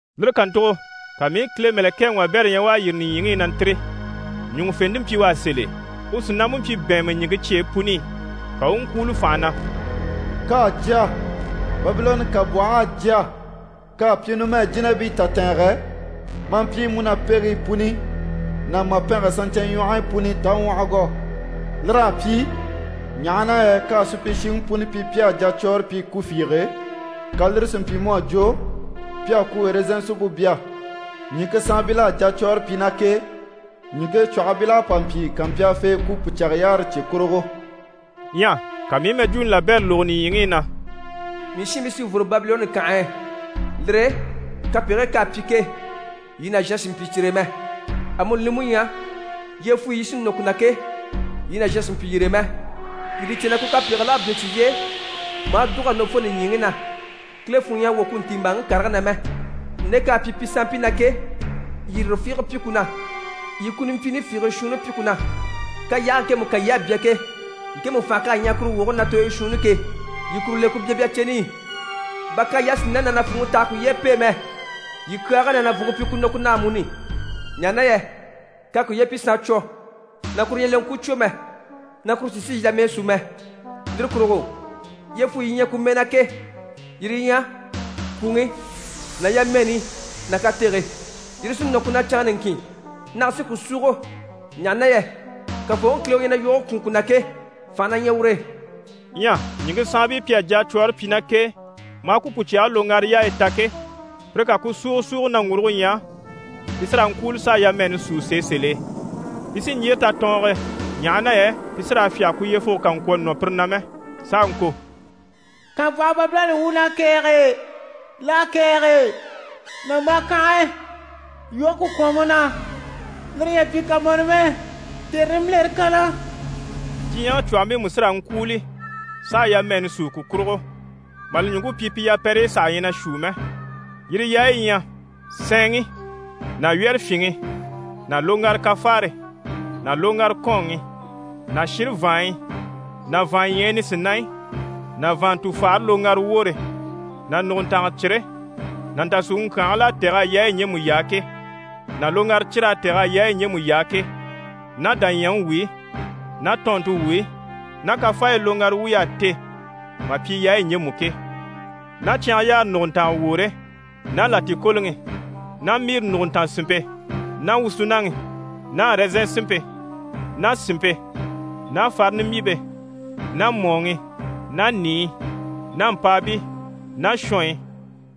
Lire kàntugo ka mii i Kile mɛ̀lɛkɛŋi wabɛrɛ ɲya u à yîri nìɲyiŋi i na ntîri. Ɲùŋufente mpyi u á sèl'e, u sìnampe mpyi bɛ̀ɛnmɛ ɲìŋke cyeyi puni i. Ka u u ŋkwúulo fànha na: «K'à jya! Babilɔnni kànbwɔh'à jya! K'à pyi numɛ jínabii tatɛɛngɛ, maa mpyi múnapegigii puni ná màpɛngɛ saɲcyɛnɲwɔhɔyi puni taŋwɔhɔgɔ. Lir'à pyi, ɲaha na yɛ k'à supyishiŋi puni pyi pi à jacwɔɔre pyi ku fiige, ka lire si mpyi mu à jwo pi à ku ɛrɛzɛn sinmpe bya. Ɲìŋke saanbil'à jacwɔɔre pyi ná k'e, ɲìŋke cwɔ̀hɔmpil'à pa mpyi kàmpyaafee ku pùcyage yaare cye kurugo.» Ɲyɛ ka mii i mɛjwuuni labɛrɛ lógo nìɲyiŋi i na: «Mii shiinbii, yii fworo Babilɔnni kànhe e, lire e kapegigii k'à pyi ke, yii nàzhan sì n‑pyi cyire e mɛ. Amuni li mú ɲyɛ, yyefuyi yi sí nɔ ku na ke, yii nàzhan sì n‑pyi yire e mɛ. Yii li cè na ku kapegigil'à bínni cyiye e, mà dùg'a nɔ fo nìɲyiŋi na. Kile funŋɔ ɲyɛ a wwɔ̀ ku ntiimbaaŋi karigii na mɛ. Nde k'à pyi pi sanmpii na ke, yii lire fiige pyi ku na. Yii ku nimpyiini fiigii shuunni pyi ku na. K'à yaage ŋkemu kan yii à bya ke, ŋkemu fànhe k'à ɲyaha kuru woge na tooyo shuunni ke, yii kuru le ku byabya ceni i. Bà k'à yasinayi ná nàfuuŋi tɛ̀g'a kuye pêe mɛ, yii kyaage ná nàvunŋke pyi ku nɔ ku na amuni, ɲaha na yɛ k'à kuye pyi saancwo, na kuru ɲyɛ leŋkwucwo mɛ, na kuru sì n‑sìi yamɛɛ sú mɛ. Lire kurugo, yyefuyi yi ɲyɛ ku mɛɛ na ke, yire yi ɲyɛ: kwùŋi ná yamɛɛni ná katege. Yire sí nɔ ku na canŋa niŋkin. Nage sí ku súugo, ɲaha na yɛ Kafooŋi Kile u ɲyɛ na yoge kwùun ku na ke, fànhe na ɲyɛ ur'e.» Ɲyɛ ɲìŋke saanbii pi à jacwɔɔre pyi ná k'e, maa ku pùcyage loŋgara yaayi ta ke, pire ká ku súugo súugo naŋguruge ɲya, pi sí raa ŋkwúuli s'a yamɛɛni súu sèe sèl'e. Pi sí n‑yyére tatɔɔnge e, ɲaha na yɛ pi sí raa fyáge ku yyefuge kà ŋkwɔ̀ nɔ pire na mɛ, s'a ŋko: «Kànbwɔhe Babilɔnni wuun'à kɛ̀ɛge! L'à kɛ̀ɛge! Nàmbaa kànhe! Yoge ku kwɔ̀n mu na, lire ɲyɛ a pyi kamɔnɔ mɛ, tère nimbilere kanna.» Diɲyɛŋi cwɔ̀hɔmpii mú sí raa ŋkwúuli s'a yamɛɛni súu ku kurugo, mà li ɲùŋke pyi pi yapɛrɛyi saha ɲyɛ na shuu mɛ. Yire yaayi yi ɲyɛ: sɛɛnŋi ná wyɛ́rɛfyinŋi ná loŋgara kafaare ná loŋgara kɔ́ɔnŋi ná shire vàanɲyi ná vàanɲyɛyi nisinaɲyi ná vàanntufagare loŋgara woore ná nùguntanga cire ná ntàsuuŋi ŋkyaangil'à tɛ̀g'a yaayi ɲjemu yaa ke, ná loŋgara cir'à tɛ̀g'a yaayi ɲjemu yaa ke, ná dàɲyɛŋi wuyi ná tɔɔnnte wuyi ná kafaayi loŋgara wuy'à te mà pyi yaayi ɲjemu ke, ná cyangayaare nùguntanga woore ná làtikoloŋi ná miri nùguntanga sìnmpe ná wusunaŋi ná ɛrɛzɛn sinmpe ná sìnmpe ná farini mbyìmpe ná mɔ̀ɔŋi ná nìiyi ná mpàabii ná shɔnyi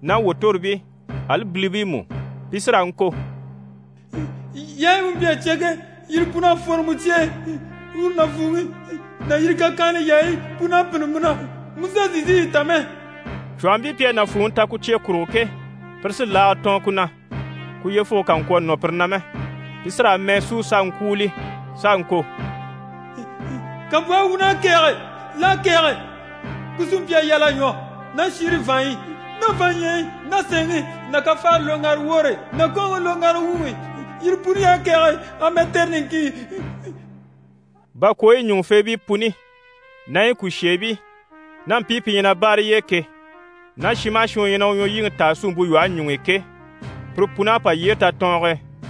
ná wòtoribii, ali bilibii mú. Pi sí raa ŋko: «Yaayi mu mpyi a cya ke, yire pun'à fworo mu cye e. Uru nàfuuŋi ná yire kakyanhala yaayi pun'à pînni mu na, mu saha sì n‑sìi yi ta mɛ.» Cwɔ̀hɔmpii pi à nàfuuŋi ta ku cye kurugo ke, pire sí laaga tɔɔn ku na, ku yyefuge kà ŋkwɔ̀ nɔ pire na mɛ. Pi sí raa mɛɛ súu s'a ŋkwúuli, s'a ŋko: «Kànbwɔhe wuun'à kɛ̀ɛge! L'à kɛ̀ɛge! Ku sí mpyi a yal'a ɲwɔ ná shire vàanɲyi ná vàanɲyɛyi ná sɛɛnŋi ná kafaare loŋgara woore ná kɔ́ɔnŋi loŋgara wuŋi i. Yire puni y'à kɛ̀ɛge amɛ tère niŋkin!» Bakwooyi ɲùŋufeebii puni ná yi kùsheebii ná mpii pi ɲyɛ na báare yi e ke, ná shin maha shin u ɲyɛ na u ɲwɔlyiŋi taa suumpe lwɔhe ɲuŋ'i ke, pire pun'à pa yyére tatɔɔnge e,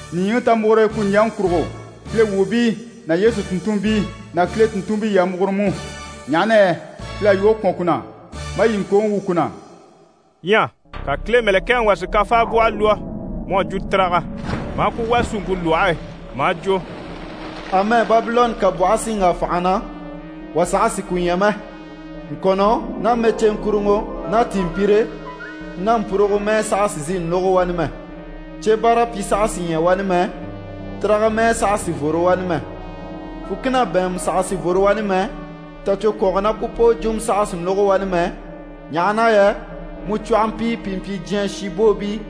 Nìɲyiŋi, ta múgure ku ɲjyaŋi kurugo! Kile wuubii ná Yesu tùnntunmpii ná Kile tùnntunmpii, yii a múgure mú, ɲaha na yɛ Kile à yogo kwɔ̀n ku na, maa yii ŋkooŋi wwû ku na.» Ɲyɛ ka Kile mɛ̀lɛkɛŋi wà si kafaabwɔhɔ lwɔ́ mu à jwo tiraga, maa ku wà suumpe lwɔhe e, maa jwo: «Amɛ Babilɔnni kànbwɔhe sí n‑wà fànha na, wà saha sì ku ɲya mɛ. Ŋkɔ̀nnɔ ná mɛceeŋkuruŋɔ ná tìinmpire ná mpurugo mɛɛ saha sì n‑sìi n‑lógo wani mɛ. Cyebaarapyi saha sì ɲya wani mɛ, tiraga mɛɛ saha sì n‑fworo wani mɛ. Fùkina bɛ̀ɛnmɛ saha sì n‑fworo wani mɛ, tacwokwɔngɔ ná ku poo jwumɔ saha sì n‑lógo wani mɛ, ɲaha na yɛ mu cwɔ̀hɔmpii pi mpyi diɲyɛ shinbwoobii,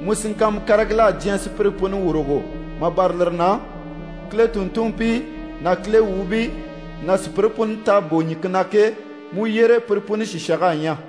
mu sìŋkanma karigil'à diɲyɛ sùpyire puni wurugo. Mà bâra lire na, Kile tùnntunmpii ná Kile wuubii ná sùpyire puni t'à bò ɲìŋke na ke, mu yyére pire puni sìshang'à ɲya.»